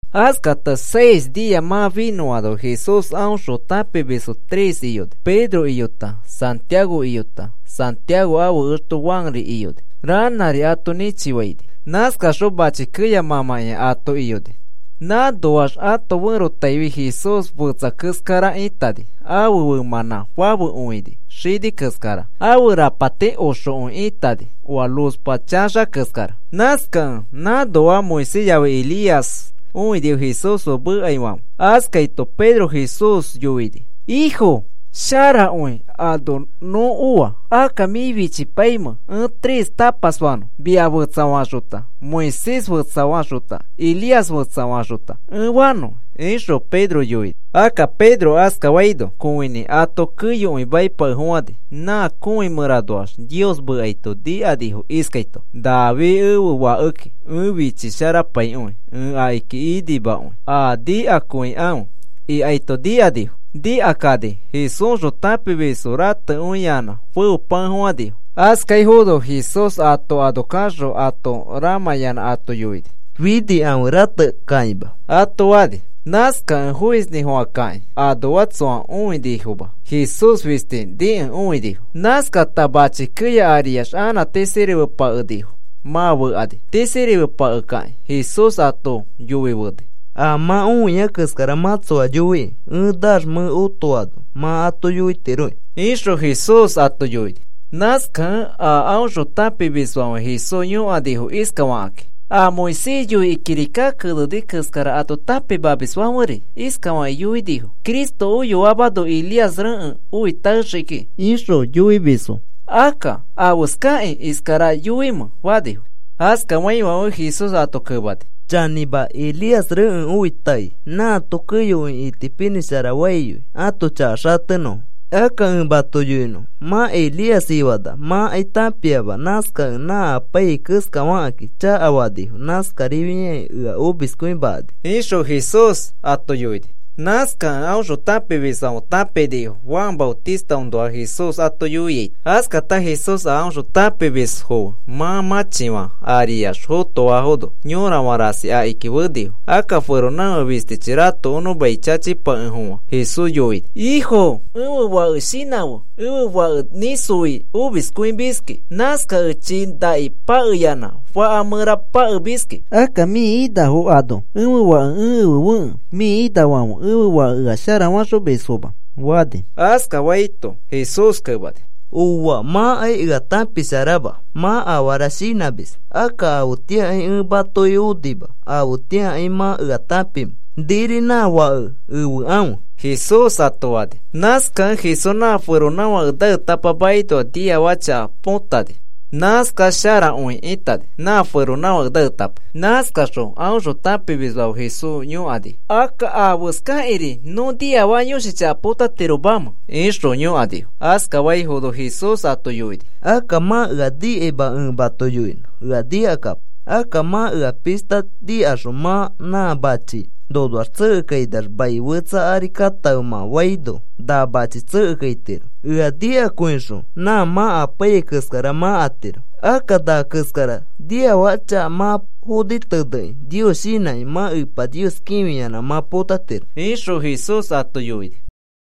Askata seis nia mã finõano Jesús aõxõ tãpimisfo tres iyoni. Pedro iyota, Santiago iyota, Santiago ãfe exto Juanri iyoni. Ranãri ato nĩchifaini. Nãskaxõ mãchi keya mãmãkĩa ato iyoini. Nãnoax ãto ferotaifi Jesús fetsa keskara ĩtani. Ãfe femãnã fafekõini xini keskara. Ãfe rapatiri oxokõi itani oa luzpa chaxa keskara. Nãskakẽ nãnoa Moisés yafi Elías õinifo Jesús fe mekaifãfe. Askaito Pedro Jesús yoini: “Ifo, sharakõi ano nõ oa. Akka, ¿mĩ fichipaimẽ ẽ tres tapas fanõ? Mia fetsafaxota, Moisés fetsafaxota, Elías fetsafaxota, ẽ fanõ,” ixõ Pedro yoini. Akka Pedro askafaino kõinĩ ato keyokõi maipakefofãni. Nã kõi mẽranoax Nios mekaito nikanifo iskaito: “Nafi ẽfe Fakeki ẽ fichisharapaikõi. Ẽ akiki inimakõi. A nikakõikãfe,” ikaito nikanifo. Nikakani Jesúsxõ tãpimisfo ratekõiyanã feopakefofãnifo. Askaifono Jesús ato ano kaxõ ato ramãyanã ato yoini: “Finikãfe. Ratekakima,” ato fani. Nãskakẽ foisinĩfofãkakĩ anoa tsoa õinifoma, Jesús fisti nikẽ õinifo. Nãskata machi keya ariax anã tisirimepakenifo mã fekani. Tisirimepakekĩ Jesús ato yoifeni: “A mã õia keskara mã tsoa yoiki. Ẽ naax mẽ anã otoano mã ato yoitiroki,” ixõ Jesús ato yoini. Nãskakẽ a aõxõ tãpimisfãfe Jesús yõkanifo iskafakakĩ: “A Moisés yoikĩ kirika keneni keskara ato tãpimamisfãferi iskafakĩ yoinifo: ‘Cristo oyoamano Elías rekẽ oi taexii kiki,’ ixõ yoimisfo. Akka, ¿afeskakĩ iskara yoimẽ?” fanifo. Askafaifãfe Jesús ato kemani: “Chanĩma, Elías rekẽ oi taei nãato keyokõi itipinĩsharafaiyoi ãto chaka xatenõfo. Akka ẽ mato yoinõ mã Elías ifana mãkai tãpiama. Nãskakẽ nã apaiyai keskafakakĩ chakafanifo. Nãskarifakĩ ea omiskõimakani,” ixõ Jesús ato yoini. Nãskakẽ aõxõ tãpimisfãfe tãpinifo Juan Maotistaõnoa Jesús ato yoiaito. Askata Jesús a aõxõ tãpimisfo fe mã mãchifã ariax fotoano yorafã rasi akiki fenifo. Akka feronãfake fistichi ratokonõ mai chachipakefofã Jesús yoini: “Ifo, ẽfe fake shinãfe. Ẽfe fake nĩsoi omiskõimiski. Nãskakẽ chii naki pakeyanã faka mẽra pakemiski. Akka mĩ inafo ano ẽfe fake ẽ efefekẽ mĩ inafãfe ẽfe fake ea sharafaxomisfoma,” fani. Askafaito Jesús kemani: “Ooa. Mãkai ea tãpisharama. Mã afara shinãmis. Akka afetĩakai ẽ matoki onima. ¿Afetĩakai mã ea tãpimẽ? Niri nã fake efekãfe,” Jesús ato fani. Nãskakẽ Jesús nã feronãfake naetapa makinoa niafaka chaka potani. Nãskax sharakõi itani nã feronãfake naetapa. Nãskaxõ aõxõ tãpimisfãfe Jesús yõkanifo: “Akka, ¿afeskakĩri nõ niafaka yõshi chaka potatiromamẽ?” ixõ yõkanifo. Askafaifono Jesús ato yoini: “Akka mã ea nikaima. Ẽ mato yoinõ, ea nikakapo. Akka mã ea pishta nikaxõ mã na machi, ‘Nonoax tsekekainax mai fetsa ari katãfe,’ mã faino na machi tsekekaitiro. Ea nikakõixõ nã mã apaiyai keskara mã atiro. Akka na keskara niafaka chaka mã foni tenekĩ Nios shinãkĩ mã Epa Nios kĩfiyanã mã potatiro,” ixõ Jesús ato yoini.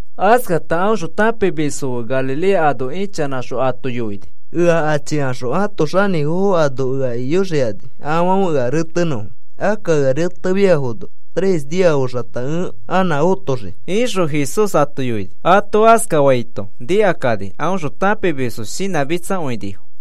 Askata aõxõ tãpimisfo fe Galilea ano ichanãxõ ato yoini: “Ea achikaxõ ãto xanĩfofo ano ea iyoxikani, afãfe ea retenõfo. Akka ea retefiafono tres nia oxata ẽ anã otoxii,” ixõ Jesús ato yoini. Ato askafaito nikakani aõxõ tãpimisfo shinãmitsakõinifo.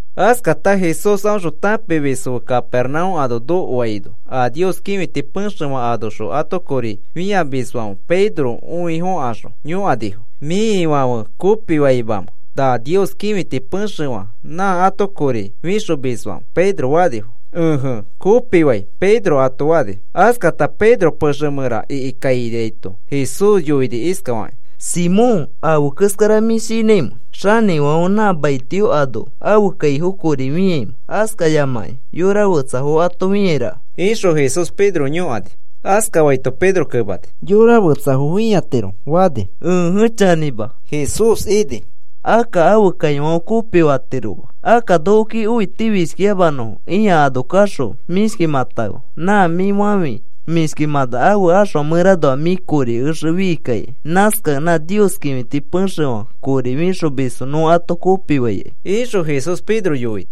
Askata Jesús aõxõ tãpimisfo fe Capernaúm ano nokoaino a Nios kĩfiti pexefã anoxõ ato kori fĩamisfãfe Pedro õifokaxõ yõkanifo: “¿Mĩ Ifãfe kopifaimamẽ na Nios kĩfiti pexefã nã ato kori fixomisfãfe?” Pedro fanifo. “Ẽje, kopifai,” Pedro ato fani. Askata Pedro pexe mẽra ikikainaito Jesús yoini iskafakĩ: “Simón, ¿afe keskara mĩ shinãimẽ? ¿Xanifãfe nã maitio anoa ãfe kaifo kori fĩaimẽ, askayamakĩ yora fetsafo ato fĩairaka?” ixõ Jesús Pedro yõkani. Askafaito Pedro kemani: “Yora fetsafo fĩatiro,” fani. “Ẽje, chanĩma,” Jesús ini. “Akka ãfe kaifãfe kopifatiroma. Akka nokoki õitifishkiyamanõfo ĩa ano kaxõ mĩshkimãtãfe. Nã mĩ fafĩ mĩshkimãna ãfe axfa mẽranoa mĩ kori exe fichikai. Nãskakẽ nã Nios kĩfiti pexefã kori fixomisfo nõ ato kopifaikai,” ixõ Jesús Pedro yoini.